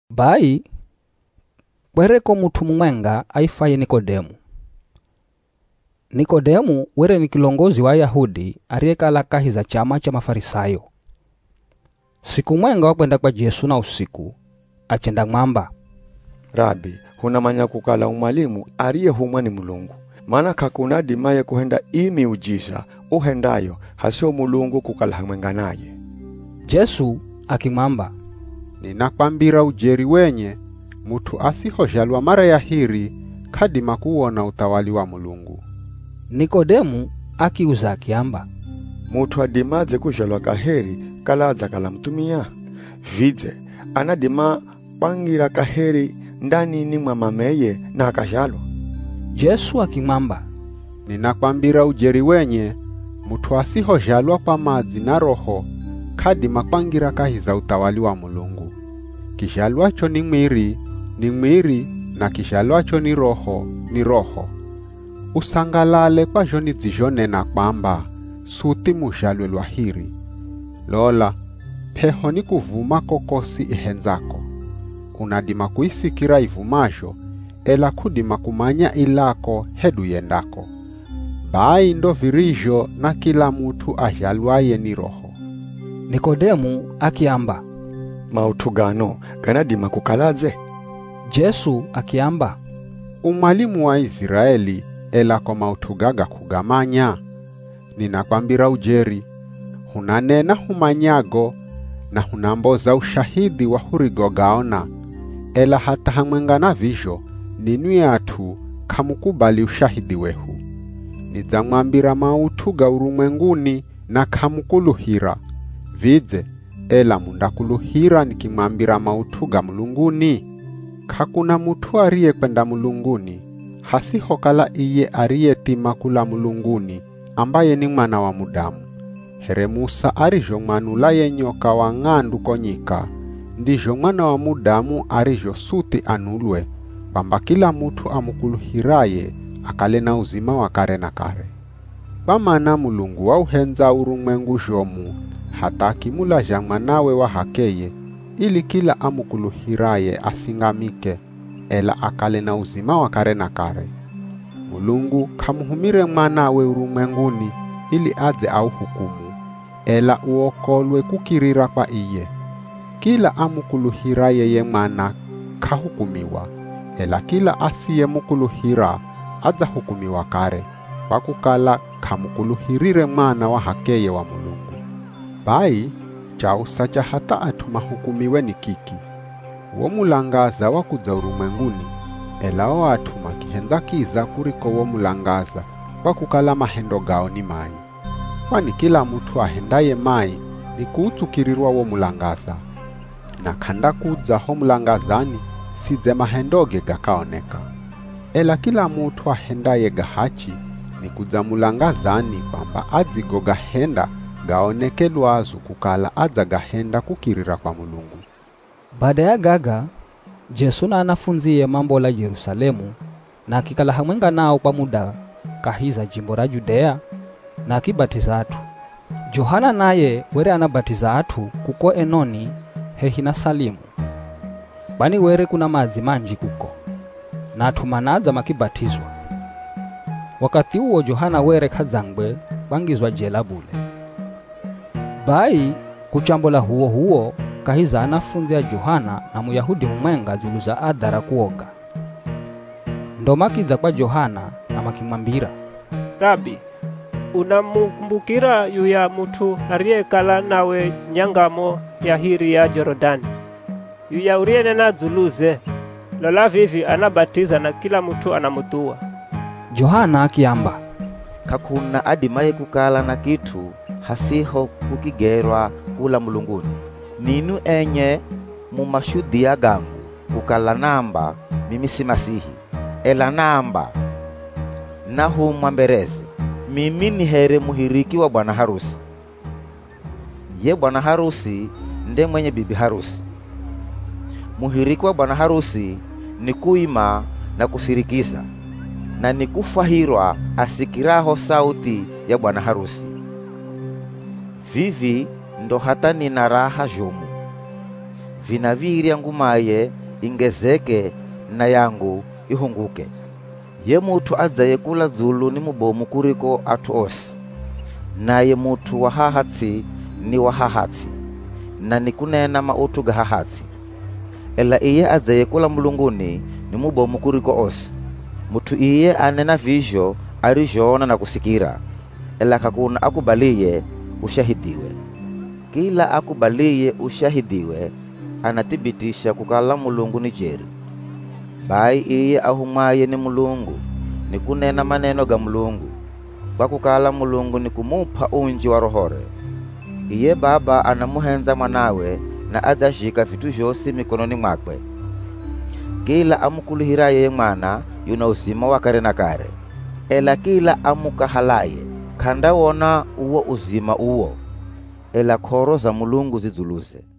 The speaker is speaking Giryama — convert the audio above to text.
Bai kwereko mut'u mumwenga aifwaye Nikodemu. Nikodemu were ni kilongozi wa Ayahudi ariyekala kahi za chama cha Mafarisayo. Siku mwenga wakwenda kwa Jesu na usiku, achendamwamba, “Rabi hunamanya kukala u mwalimu ariyehumwa ni Mulungu. Mana k'akuna adimaye kuhenda ii miujiza uhendayo hasiho Mulungu kukala hamwenga naye.” Jesu akimwamba, “Ninakwambira ujeri wenye, mut'u asihozhalwa mara ya hiri, k'adima kuwona uthawali wa Mulungu.” Nikodemu akiuza akiamba, “Mut'u adimadze kuzhalwa kaheri kala adzakala muthumia? Vidze anadima kwangira kaheri ndanini mwa mameye na akazhalwa?” Jesu akimwamba, “Ninakwambira ujeri wenye, mut'u asihozhalwa kwa madzi na Roho k'adima kwangira kahi za uthawali wa Mulungu. Kizhalwacho ni mwiri, ni mwiri na kizhalwacho ni Roho, ni roho. Usangalale kwa zho nidzizhonena kwamba, ‘Suthi muzhalwe lwa hiri.’ Lola p'eho nikuvuma kokosi ihendzako. Unadima kuisikira ivumazho, ela k'udima kumanya ilako hedu yendako. Bai ndo virizho na kila mut'u azhalwaye ni Roho.” Nikodemu akiamba, “Maut'u gano ganadima kukaladze?” Jesu akiamba, “U mwalimu wa Iziraeli, ela ko maut'u gaga k'ugamanya? Ninakwambira ujeri, hunanena humanyago na hunamboza ushahidhi wa hurigogaona, ela hatha hamwenga na vizho ninwi at'u k'amukubali ushahidhi wehu. Nidzamwambira maut'u ga urumwenguni na k'amukuluhira. Vidze, ela mundakuluhira nikimwambira maut'u ga mulunguni? “K'akuna mut'u ariyekwenda mulunguni, hasihokala iye ariyethima kula mulunguni ambaye ni Mwana wa Mudamu. Here Musa arizhomwanula ye nyoka wa ng'andu ko nyika, ndizho Mwana wa Mudamu arizho suthi anulwe, kwamba kila mut'u amukuluhiraye akale na uzima wa kare na kare. “Kwa mana Mulungu wauhendza urumwengu zhomu hatha akimulazha Mwanawe wa h'akeye ili kila amukuluhiraye asingamike, ela akale na uzima wa kare na kare. Mulungu k'amuhumire Mwanawe urumwenguni ili adze auhukumu, ela uokolwe kukirira kwa iye. Kila amukuluhiraye ye Mwana k'ahukumiwa, ela kila asiyemukuluhira adzahukumiwa kare, kwa kukala k'amukuluhirire Mwana wa h'akeye wa Mulungu. “Bai chausa cha hatha at'u mahukumiwe ni kiki; wo mulangaza wakudza urumwenguni, ela o at'u makihendza kiza kuriko wo mulangaza kwa kukala mahendo gao ni mai. Kwani kila mut'u ahendaye mai nikuutsukirirwa wo mulangaza, na k'andakudza ho mulangazani sidze mahendoge gakaoneka. Ela kila mut'u ahendaye ga hachi nikudza mulangazani kwamba adzigogahenda gaoneke lwazu kukala adzagahenda kukirira kwa Mulungu.” Bada ya gaga, Jesu na anafundzie mambola Jerusalemu na akikala hamwenga nao kwa muda kahi za jimbo ra Judea na akibat'iza at'u. Johana naye were anabat'iza at'u kuko Enoni hehi na Salimu, kwani were kuna madzi manji kuko, na at'u manadza makibat'izwa. Wakathi uwo Johana were k'adzangwe kwangizwa jela bule. Bai kuchambola h'uwoh'uwo kahi za anafundzi a Johana na Muyahudi mumwenga dzulu za adha ra kuoga. Ndo makidza kwa Johana na makimwambira, “Rabi, unamukumbukira yuya mut'u ariyekala nawe nyangamo ya hiri ya Jorodani, yuya uriyenena dzuluze? Lola vivi anabat'iza na kila mut'u anamuthuwa!” Johana akiamba, “K'akuna adimaye kukala na kit'u hasiho kukigerwa kula mulunguni. Ninwi enye mu mashudhia gangu kukala naamba, ‘Mimi si Masihi,’ ela naamba, ‘Nahumwa mbereze.’ Mimi ni here muhiriki wa bwana harusi. Ye bwana harusi nde mwenye bibi harusi. Muhiriki wa bwana harusi nikuima na kusirikiza, na nikufwahirwa asikiraho sauthi ya bwana harusi. Vivi ndo hatha nina raha zhomu. Vinav̱irya ngumaye ingezeke na yangu ihunguke. “Ye mut'u adzaye kula dzulu ni mubomu kuriko at'u osi; naye mut'u wa haha ts'i ni wa haha ts'i, na nikunena maut'u ga haha ts'i. Ela iye adzaye kula mulunguni ni mubomu kuriko osi. Mut'u iye anena vizho arizhoona na kusikira, ela k'akuna akubaliye ushahidhiwe. Kila akubaliye ushahidhiwe anathibitisha kukala Mulungu ni jeri. Bai iye ahumwaye ni Mulungu nikunena maneno ga Mulungu, kwa kukala Mulungu nikumup'a unji wa Rohore. “Iye Baba anamuhendza Mwanawe na adzazhika vit'u zhosi mikononi mwakwe. Kila amukuluhiraye ye Mwana yuna uzima wa kare na kare, ela kila amukahalaye k'andawona uwo uzima uwo, ela k'oro za Mulungu zi dzuluze.”